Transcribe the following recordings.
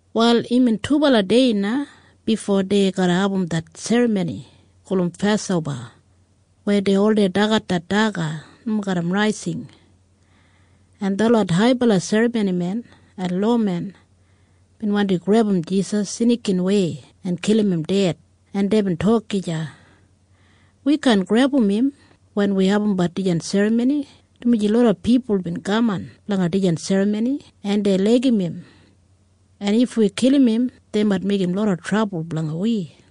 Wal imbin dubala dei na bifo dei garra abum det serramoni gulum Pasoba weya dei oldei dagat det daga nomo garram raising, en detlot haibala serramonimen en lowamen bin wandi grebum Jisas snikinwei en kilim im ded, en deibin tok gija, “Wi kaan grebum im wen wi abumbat dijan serramoni, dumaji loda pipul bin kaman blanga dijan serramoni, en dei laigim im, en if wi kilim im, dei mait meigim loda trabul blanga wi.”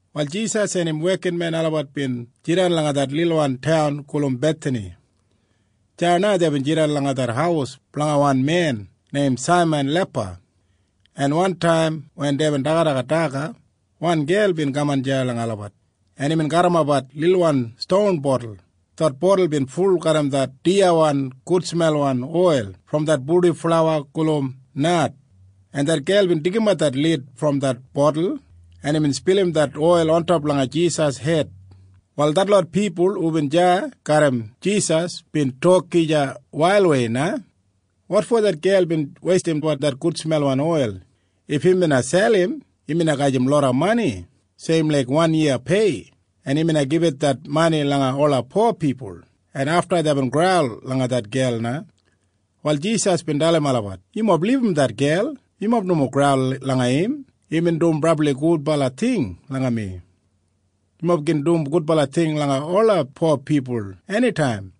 Wal Jisas en im wekinmen olabat bin jidan langa det lilwan taun gulum Bethani. Deya na deibin jidan langa det haus blanga wan men neim Saiman Lepa, en wantaim wen deibin dagadagat daga, wan gel bin kaman deya langa olabat, en imbin garrimapbat lilwan ston botul. Det botul bin ful garram det diyawan gudsmelwan oil brom det purdiflawa gulum nard, en det gel bin deigimat det lid brom det botul, en imbin spilim det oil ontop langa Jisas hed. Wal detlot pipul hubin deya garram Jisas bin tok gija wailwei na, “Wotfo det gel bin weistimbat det gudsmelwan oil? If im bina selim, im bina gajim loda mani seim laik wan yiya pei, en im bina gibit det mani langa ola po pipul.” En afta deibin graul langa det gel na. Wal Jisas bin dalim olabat, “Yumob libum det gel. Yumob nomo graul langa im. Imbin dum brabli gudbala ting langa mi. Yumob gin dum gudbala ting langa ola po pipul enitaim,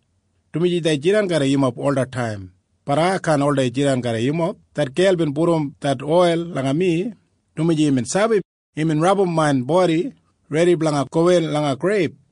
dumaji dei jidan garram yumob olataim. Bat ai kaan oldei jidan garram yumob. Det gel bin pudum det oil langa mi, dumaji imbin sabi. Imbin rabum main bodi redi blanga gowin langa greib.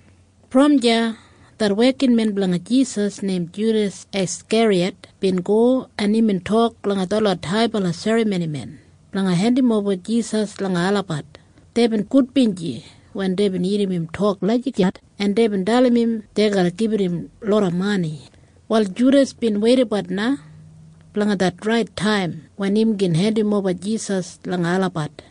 Brom deya det wekinmen blanga Jisas neim Judas Askeriyat bin go, en imbin tok langa detlot haibala serramonimen blanga hendimoba Jisas langa olabat. Deibin gudbinji wen deibin irrim im tok lagijat, en deibin dalim im dei garra gibit im loda mani. Wal Judas bin weidabat na blanga det rait taim wen im gin hendimoba Jisas langa olabat.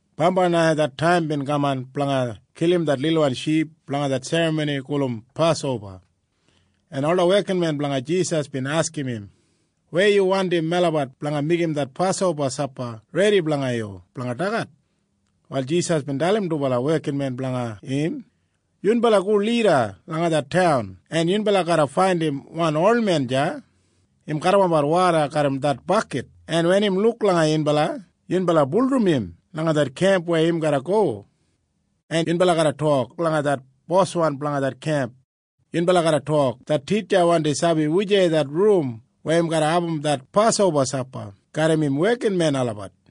Bambai na det taim bin kaman blanga kilim det lilwan ship blanga det serramoni gulum Pasoba, en ola wekinmen blanga Jisas bin askim im, “Weya yu wandim melabat blanga meigim det Pasoba sapa redi blanga yu blanga dagat?” Wal Jisas bin dalim dubala wekinmen blanga im, “Yunbala go lida langa det taun, en yunbala garra faindim wan olmen deya im garrimapbat woda garram det bakit. En wen im luk langa yunbala, yunbala bulurrum im langa det kemp weya im garra go, en yunbala tok langa det boswan blanga det kemp. Yunbala garra tok, ‘Det Titja wandi sabi wujei det rum weya im garra abum det Pasoba sapa garram im wekinmen olabat.’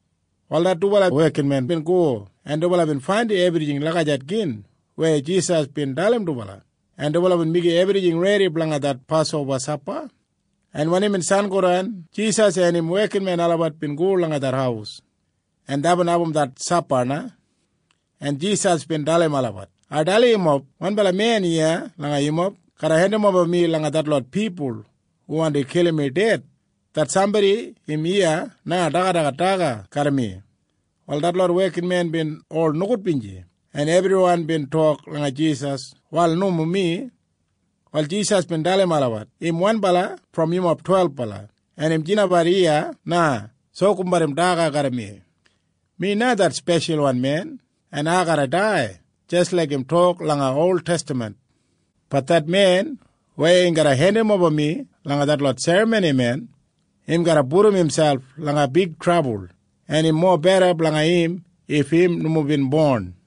Wal det dubala wekinmen bin go, en dubala bin faindim ebrijing lagijat gin weya Jisas bin dalim dubala, en dubala bin meigim ebrijing redi blanga det Pasoba sapa, en wen imbin sangodan, Jisas en im wekinmen olabat bin go langa det haus, en deibin abum det sapa na, en Jisas bin dalim olabat, “Ai dalim yumob. Wanbala men iya langa yumob garra hendimoba mi langa detlot pipul hu wandi kilim mi ded. Det sambodi im iya na dagadagat daga garram mi.” Wal detlot wekinmen bin ol nogudbinji, en ebriwan bin tok langa Jisas, “Wal nomo mi.” Wal Jisas bin dalim olabat, “Im wanbala brom yumob twelbala, en im jidanbat iya na sokumbat im daga garram mi. Mi na det Speshalwan Men, en ai garra dai jis laik im tok langa oltestaman. Bat det men weya garra hendimoba mi langa detlot serramonimen, im garra pudum imselp langa big trabul, en im mobeda blanga im if im nomo bina bon.”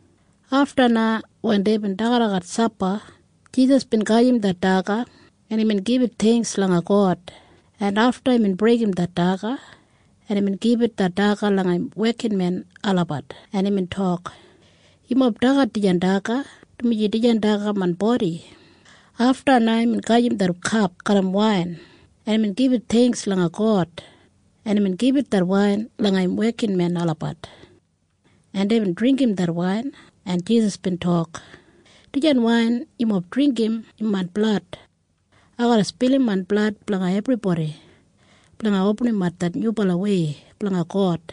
Afta na wen deibin dagadagat sapa, Jisas bin gajim det daga, en imbin gibit theingks langa God, en afta imbin breigim det daga, en imbin gibit det daga langa im wekinmenmob, en imbin tok, “Yumob dagat dijan daga, dumaji dijan daga main bodi.” Afta na imbin gajim det kap garram wain, en imbin gibit theingks langa God, en imbin gibit det wain langa im wekinmen olabat, en deibin dringgim det wain, en Jisas bin tok, “Dijan wain yumob dringgim im main blad. Ai garra spilim main blad blanga ebribodi blanga opinimap det nyubalawei blanga God.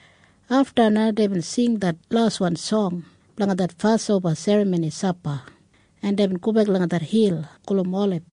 Afta na deibin sing det laswan song blanga det Pasoba Serramoni sapa, en deibin go langa det hil gulum Olib.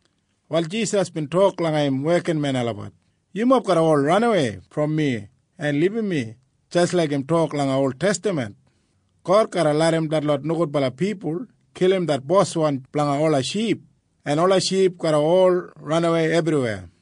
Wal Jisas bin tok langa im wekinmen olabat, “Yumob garra ol ranawei brom mi en libum mi jis laik im tok langa oltestaman, ‘God garra larram detlot nogudbala pipul kilim det boswan blanga ola ship, en ola ship garra ol ranawei ebriweya.’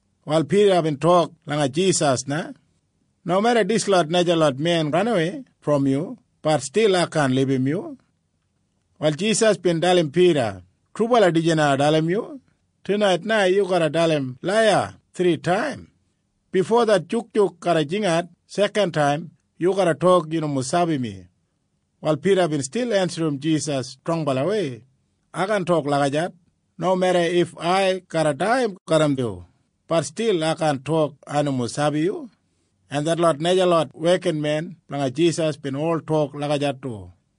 Wal Pida bin tok langa Jisas na, “Nomeda dislot najalot men ranawei brom yu, bat stil ai kaan libum yu.” Wal Jisas bin tok langa Pida, “Trubala ai sabi wanim garra hepin tunait na. Yu garra dalim laiya thritaim. Bifo det jukjuk garra jingat sekantaim yu garra tok yu nomo sabi mi.” Wal Pida bin stil ensim Jisas strongbalawei, “Ai kaan tok lagijat! Nomeda if ai garra dai garram yu, bat stil ai kaan tok ai nomo sabi yu.” En detlot najalot wekinmen blanga Jisas bin ol tok lagijat du.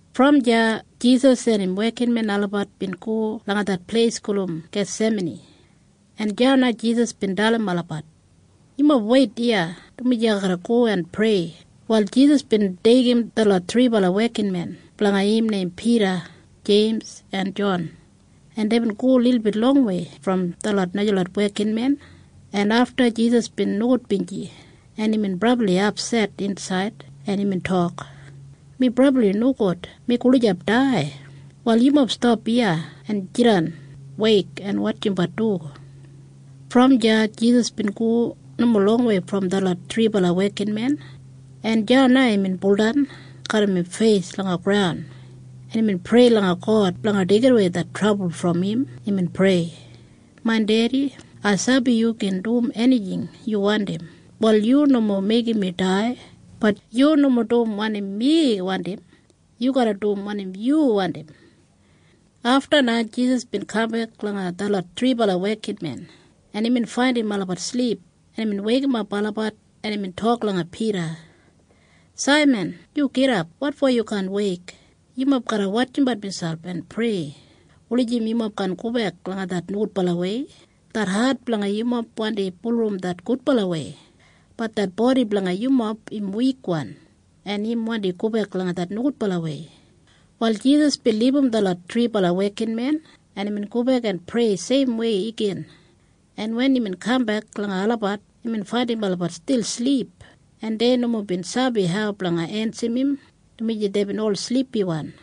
Brom deya Jisas en im wekinmen olabat bin go langa det pleis gulum Gesimani, en deya na Jisas bin dalim olabat, “Yumob weit iya, dumaji ai garra go en prei.” Wal Jisas bin deigim detlot thribala wekinmen blanga im neim Pida, Jeims en Jon, en deibin go lilbit longwei brom detlot najalot wekinmen, en afta Jisas bin nogudbinji, en imbin brabli apset insaid, en imbin tok, “Mi brabli nogudbinji. Mi gulijap dai. Wal yumob stap iya en jidan weik en wotjimbat du.” Brom deya Jisas bin go nomo longwei brom detlot thribala wekinmen, en deya na imbin baudan garram im feis langa graun, en imbin prei langa God blanga deigidawei det trabul brom im. Imbin prei, “Main Dedi, ai sabi yu gin dum enijing yu wandim. Wal yu nomo meigim mi dai. Bat yu nomo dum wanim mi wandim. Yu garra dum wanim yu wandim.” Afta na Jisas bin kambek langa detlot thribala wekinmen, en imbin faindim olabat silip, en imbin weikimap olabat, en imbin tok langa Pida, “Saiman! Yu gidap! Wotfo yu kaan weik? Yumob garra wotjimbat miselp en prei blanga nomo gobek langa det nogudbalawei. Det hat blanga yumob wandi bulurrum det gudbalawei. Bat det bodi blanga yumob im wikwan, en im wandi gobek langa det nogudbalawei.” Wal Jisas bin libum detlot thribala wekinmen, en imbin gobek en prei seimwei igin, en wen imbin kambek langa olabat, imbin faindim olabat stil silip. En dei nomo bin sabi hau blanga ensim im, dumaji deibin ol silipiwan.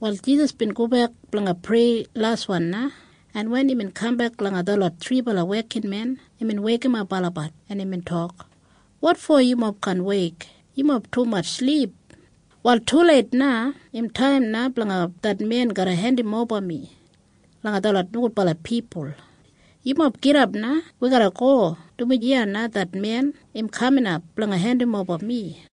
Wal Jisas bin gobek blanga prei laswan na, en wen imbin kambek langa detlot thribala wekinmen, imbin weikimap olabat, en imbin tok, “Wotfo yumob kaan weik? Yumob tumatj silip. Wal tuleit na. Im taim na blanga det men garra hendimoba mi langa detlot nogudbala pipul. Yumob gidap na. Wi garra go, dumaji iya na det men im kaminap blanga hendimoba mi.”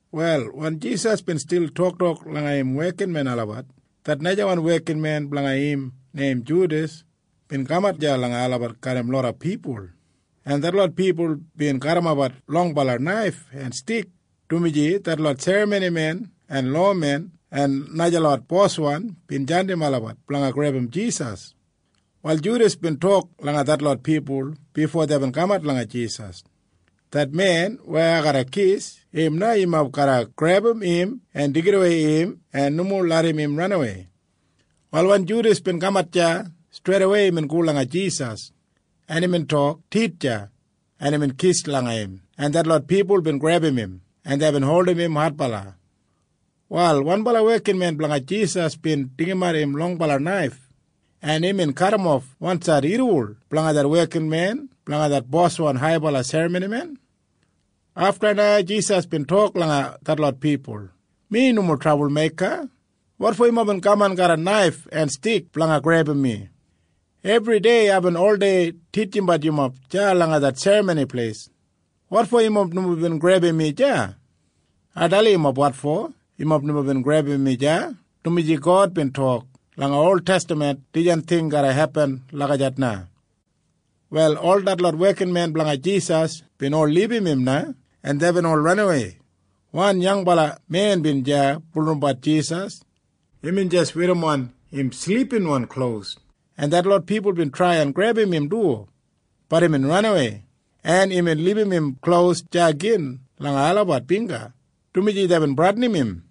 Wal wen Jisas bin stil toktok langa im wekinmen olabat, det najawan wekinmen blanga im neim Judas bin kamat deya langa olabat garram loda pipul. En detlot pipul bin garrimapbat longbala naif en stik, dumaji detlot serramonimen en lowamen en najalot boswan bin jandim olabat blanga grebum Jisas. Wal Judas bin tok langa detlot pipul bifo deibin kamat langa Jisas, “Det men weya ai garra kis, im na yumob garra grebum im en deigidawei im en nomo larram im ranawei.” Wal wen Judas bin kamat deya, streidawei imbin go langa Jisas, en imbin tok, “Titja!” En imbin kis langa im, en detlot pipul bin grebum im, en deibin holdim im adbala. Wal wanbala wekinmen blanga Jisas bin deigimat im longwan naif, en imbin kadimof wansaid irriwol blanga det wekinmen blanga det boswan haibala serramonimen. Afta na Jisas bin tok langa detlot pipul, “Ai nomo bin meigim trabul. Wotfo yumob bin kaman garram naif en stik blanga grebum mi? Ebridei aibin oldei titjimbat yumob deya langa det Serramoni Pleis. Wotfo yumob nomo bin grebum mi deya? Ai dalim yumob wotfo. Yumob nomo bin grebum mi deya, dumaji God bin tok langa oltestaman dijan ting garra hepin lagijat na.” Wal ol detlot wekinmen blanga Jisas bin ol libum im na, en deibin ol ranawei. Wan yangbala men bin deya bulurrumbat Jisas. Imbin jis werrimon im silipinwan klos, en detlot pipul bin trai en grebum im du. Bat imbin ranawei, en imbin libum im klos deya gin langa olabat bingga, dumaji deibin bradinim im.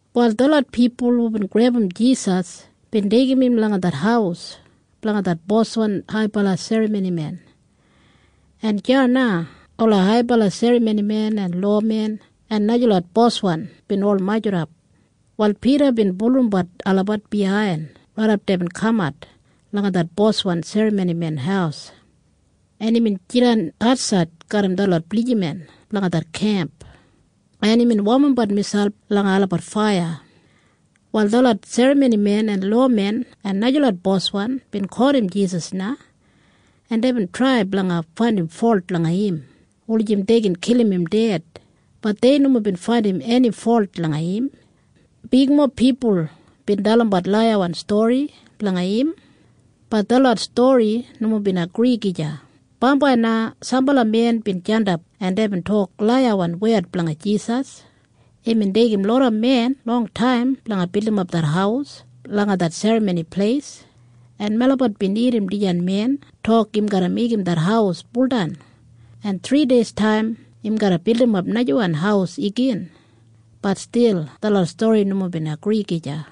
Wal detlot pipul hubin grebum Jisas bin deigim im langa det haus blanga det boswan haibala serramonimen, en deya na ola haibala serramonimen en lowamen en najalot boswan bin ol majurrap. Wal Pida bin bulurrumbat olabat biyain raidap deibin kamat langa det boswan serramonimen haus, en imbin jidan atsaid garram detlot blijiman blanga det kemp, en imbin womimbat miselp langa olabat faiya. Wal detlot serramonimen en lowamen en najalot boswan bin kotim Jisas na, en deibin trai blanga faindim folt langa im blanga kilim im ded. Bat dei nomo bin faindim eni folt langa im. Bigmob pipul bin dalimbat laiyawan stori blanga im. Bat detlot stori nomo bin agri gija. Bambai na sambala men bin jandap, en deibin tok laiyawan wed blanga Jisas, “Imbin deigim loda men longtaim blanga bildimap det haus langa det Serramoni Pleis, en melabat bin irrim dijan men tok im garra meigim det haus buldan, en thrideistaim im garra bildimap najawan haus igin.” Bat stil detlot stori nomo bin agri gija.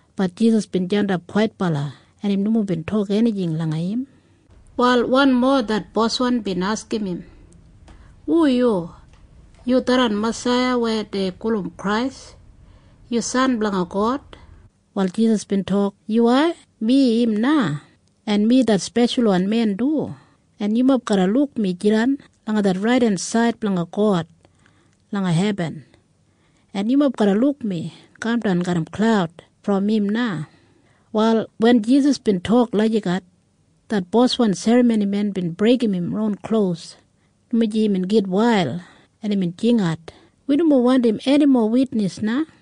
Bat Jisas bin jandap kwaitbala, en im nomo bin tok enijing langa im. Wal wanmo det boswan bin askim im, “Hu yu? Yu tharran Masaiya weya dei gulum Krais? Yu San blanga God?” Wal Jisas bin tok, “Yuwai. Mi na im. En mi det Speshalwan Men du. En yumob garra luk mi jidan langa det raidensaid blanga God langa hebin, en yumob garra luk mi kamdan garram klaud brom im na.” Wal wen Jisas bin tok lagijat, det boswan serramonimen bin breigim im klos, dumaji imbin gitwail, en imbin jingat, “Wi nomo wandim enimo witnis na!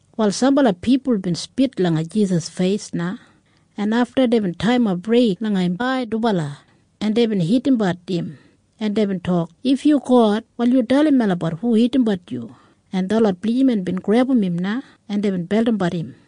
Wal sambala pipul bin spit langa Jisas feis na, en afta deibin taiyimap reig langa im dubala ai, en deibin hitimbat im, en deibin tok, “If yu God, wal yu dalim melabat hu hitimbat yu?” En detlot blijiman bin grebum im na, en deibin beldimbat im.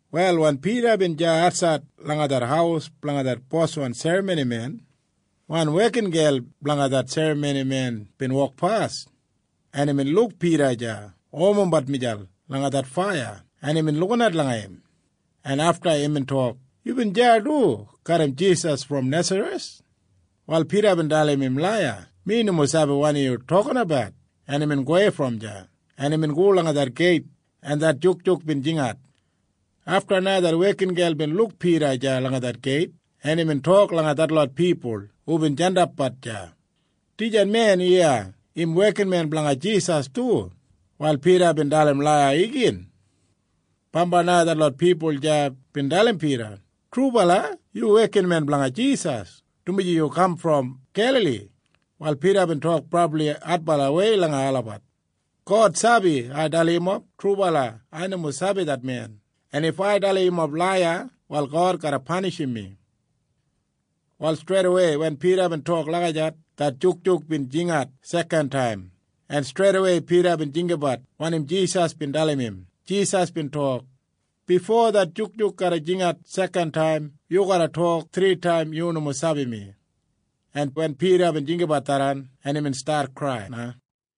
Wal wen Pida bin deya atsaid langa det haus blanga det boswan serramonimen, wan wekingel blanga det serramonimen bin wokpas, en imbin luk Pida deya womimbat miselp langa det faiya, en imbin lukinat langa im, en afta imbin tok, “Yubin deya du garram Jisas brom Nesareth.” Wal Pida bin dalim laiya, “Mi nomo sabi wanim yu toktok.” En imbin gowei brom deya, en imbin go langa det geit, en det jukjuk bin jingat. Afta na det wekingel bin luk Pida deya langa det geit, en imbin tok langa detlot pipul hubin jandapbat deya, “Dijan men iya im wekinmen blanga Jisas du.” Wal Pida bin dalim laiya igin. Bambai na detlot pipul deya bin dalim Pida, “Trubala yu wekinmen blanga Jisas, dumaji yu kaman brom Gelali.” Wal Pida bin tok brabli adbalawei langa olabat, “God sabi ai dalim yumob trubala ai nomo sabi det men. En if ai dalim yumob laiya, wal God garra panishim mi.” Wal streidawei wen Pida bin tok lagijat, det jukjuk bin jingat sekantaim, en streidawei Pida bin jinggabat wanim Jisas bin dalim im. Jisas bin tok, “Bifo det jukjuk garra jingat sekantaim, yu garra tok thritaim yu nomo sabi mi.” En wen Pida bin jinggabat tharran, imbin stat krai na.